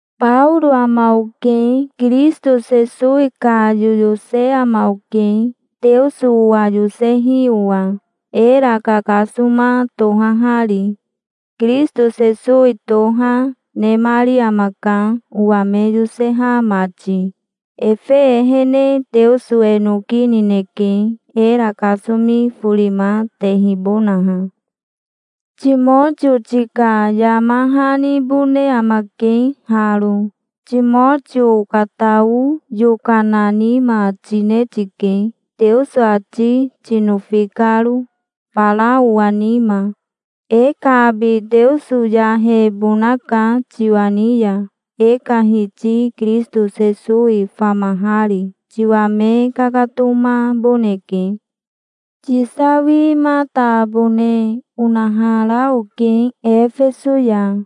Baoro ama oke. Kirisito Sesowi ka yoyose ama oke, Teoso owa yosehi owa, era kakasoma tohahari. Kirisito Sesowi toha, nemari amaka, owa me yoseha mati. Efe ehene Teoso e noki nineke, era kasomi forima tehibonaha. Timotio tika yama hanibone amake haro. Timotio okatao yokana nima tine tike, Teoso ati tinofi karo fara owa nima. E ka abi Teoso yahebonaka tiwa ni ya, e ka Hiti Kirisito Sesowi famahari. Tiwa me kakatomaboneke. Tisawimatabone onahara oke Efeso ya.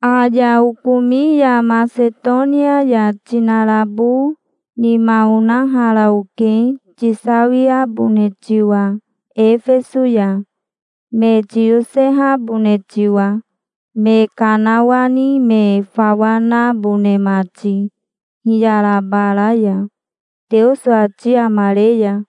Aya okomi ya Masetonia ya tinarabo nima onahara oke tisawiabone tiwa Efeso ya, me tiyosehabone tiwa, me kanawani me fawa nabone mati hiyara bara ya, Teoso ati amare ya.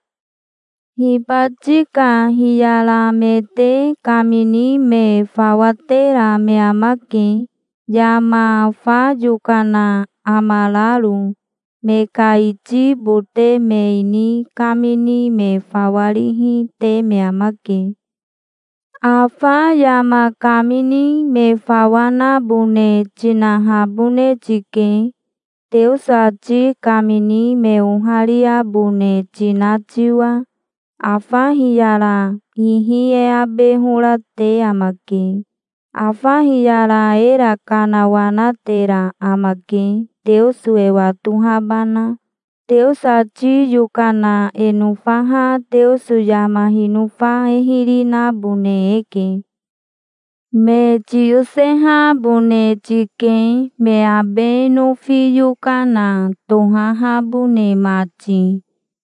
Hibati ka hiyaramete kamini me fawa tera me amake, yama fa yokana amararo. Me ka iti bote me ini kamini me fawa rihi te me amake. Afa yama kamini me fawa nabone tinahabone tike, Teoso ati kamini me ohariabone tina tiwa. Afa hiyara ihi e abe hora te amake. Afa hiyara era kanawanatera amake, Teoso e watohabana. Teoso ati yokana e nofaha Teoso yama hinofa e hiri nabone eke. Me tiyosehabone tike, me abe nofi yokana tohahabone mati.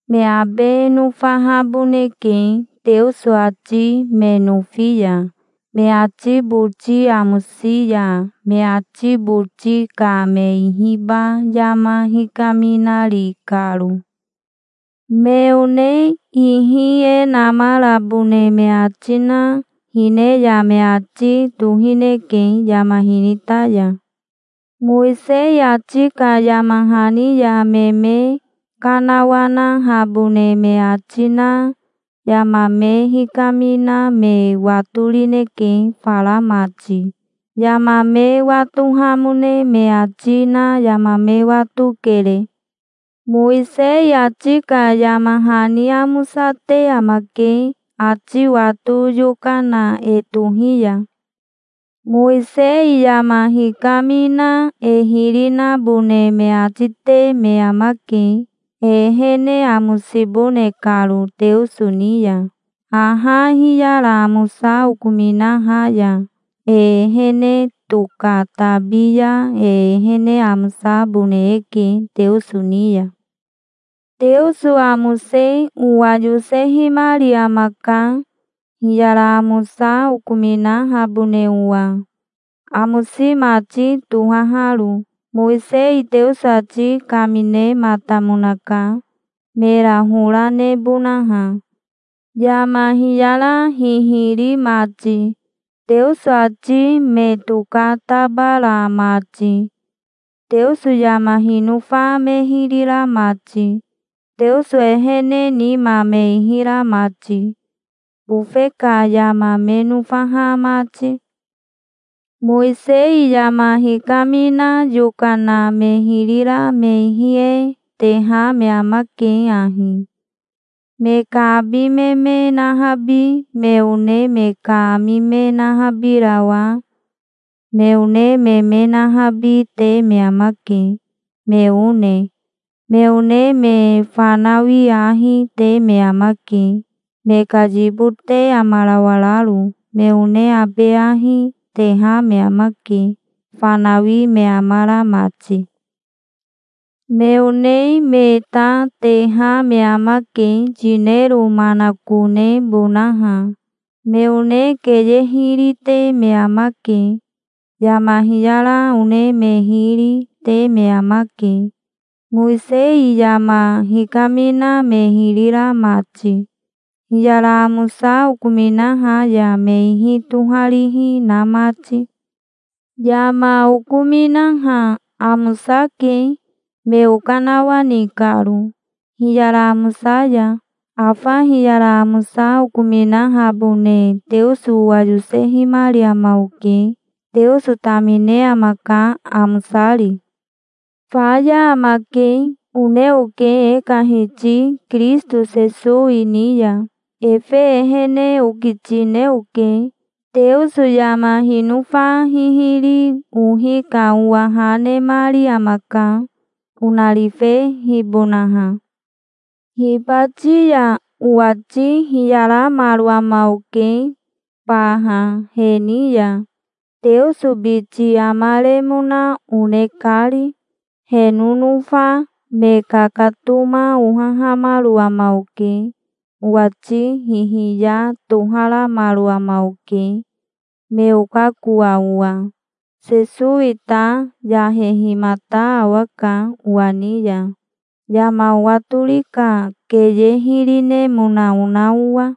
Me abe nofahaboneke, Teoso ati me nofi ya, me ati boti amosi ya, me ati boti ka me ihiba yama hikaminari karo. Me one ihi e namarabone me ati na hine ya me ati tohineke, yama hinita ya. Mowisei ati ka yama hani ya me me kanawanahabone me ati na yama me hikamina me watorineke fara mati. Yama me watohamone me ati na yama me watokere. Mowisei ati ka yama hani amosate amake, ati wato yokana e tohi ya. Mowisei yama hikamina e hiri nabone me ati te me amake, e ehene amosibone karo Teoso ni ya. Haha hiyara amosa okominaha ya e ehene tokatabi ya e ehene amosabone eke Teoso ni ya. Teoso amose owa yosehimari amaka, hiyara amosa okominahabone owa, amosi mati tohaharo. Mowisei Teoso ati kaminematamonaka, mera hora nebonaha, yama hiyara hihiri mati, Teoso ati me tokatabara mati, Teoso yama hinofa me hiri ra mati, Teoso ehene nima me ihi ra mati, bofe ka yama me nofaha mati. Mowisei yama hikamina yokana me hiri ra me ihi e teha me amake ahi: me ka abi me me nahabi, me one me ka ami me nahabirawa, me one me me nahabi, te me amake, me one. Me one me fanawi ahi, te me amake, me ka yibote amarawararo. Me one abe ahi, teha me amake, fanawi me amara mati. Me one me ta teha me amake, yinero manakonebonaha. Me one keye hiri, te me amake. Yama hiyara one me hiri, te me amake, Mowisei yama hikamina me hiri ra mati, hiyara amosa okominaha ya me ihi toharihi na mati. Yama okominaha amosake, me okanawani karo hiyara amosa ya. Afa hiyara amosa okominahabone Teoso owa yosehimari ama oke. Teoso tamine amaka, amosari. "Faya amake", one oke e ka Hiti Kirisito Sesowi ni ya. Efe ehene okitine oke. Teoso yama hinofa hihiri ohi ka owa ha nemari amaka, onarifehibonaha. Hibati ya owati hiyaramaro ama oke baha he ni ya, Teoso biti amaremona one kari. He nonofa me kakatoma ohahamaro ama oke. Owati hihiya toharamaro ama oke, me okakoa owa. Sesowi ta yahehimata awaka owa ni ya, yama owatori ka keye hiri nemona ona owa.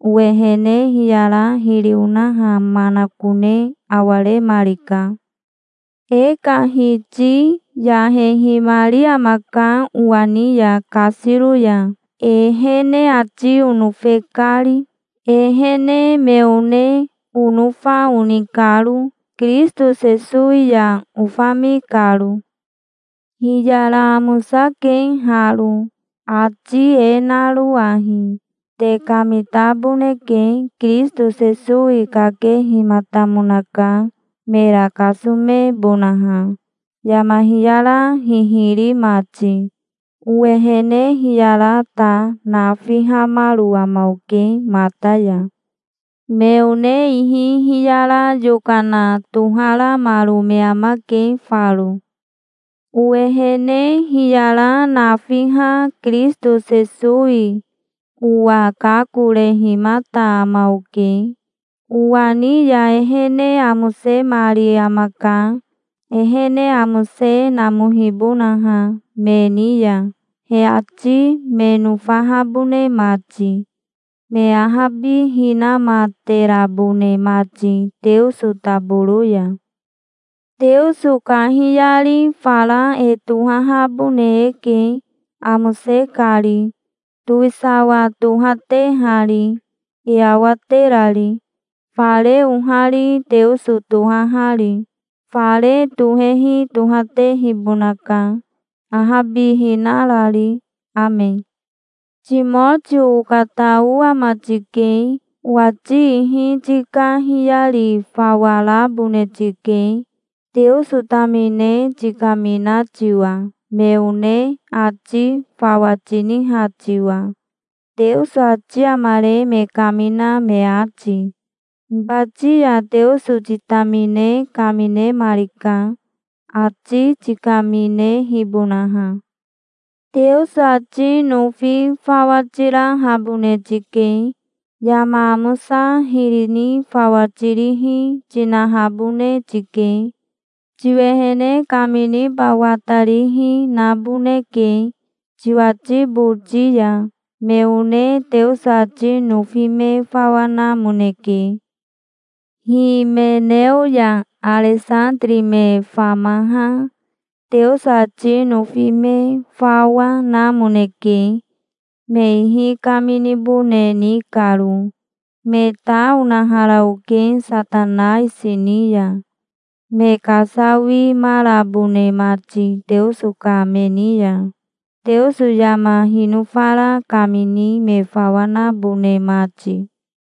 Owehene hiyara hiri onaha manakone awaremarika. E ka Hiti yahehimari amaka owa ni ya, kasiro ya, ehene ati onofe kari, ehene me one onofa oni karo, Kirisito Sesowi ya ofami karo. Hiyara amosake haro, ati e naro ahi. Te kamitaboneke. Kirisito Sesowi kakehimatamonaka, mera kasomebonaha, yama hiyara hihiri mati. Owehene hiyara ta nafihamaro ama oke mata ya. Me one ihi hiyara yokana toharamaro me amake faro. Owehene hiyara nafiha Kirisito Sesowi owa kakorehimata ama oke. Owa ni ya ehene amosemari amaka, ehene amose namohibonaha, me ni ya, he ati me nofahabone mati, me ahabihinamaterabone mati Teoso taboro ya. Teoso kahiyari fara e tohahabone eke, amose kari, towisawa tohatehari, e awaterari, fare ohari Teoso tohahari. Fare tohehi tohatehibonaka, ahabihina rari. Ame. Timotio okatao ama tike. Owati ihi tika hiyari fawa rabone tike, Teoso tamine tikamina tiwa, me one ati fawa tiniha tiwa, Teoso ati amare me kamina me ati. Hibati ya Teoso titamine kaminemarika, ati tikaminehibonaha. Teoso ati nofi fawa tirahabone tike. Yama amosa hiri ni fawa tirihi, tinahabone tike. Tiwehene kaminiba watarihi, naboneke, tiwati boti ya. Me one Teoso ati nofi me fawa namoneke. Himeneo ya Aresatiri me famaha Teoso ati nofi me fawa, namoneke, me ihi kaminibone ni karo. Me ta onahara oke Satanaisi ni ya, me kasawimarabone mati Teoso ka me ni ya, Teoso yama hinofara kamini me fawa nabone mati.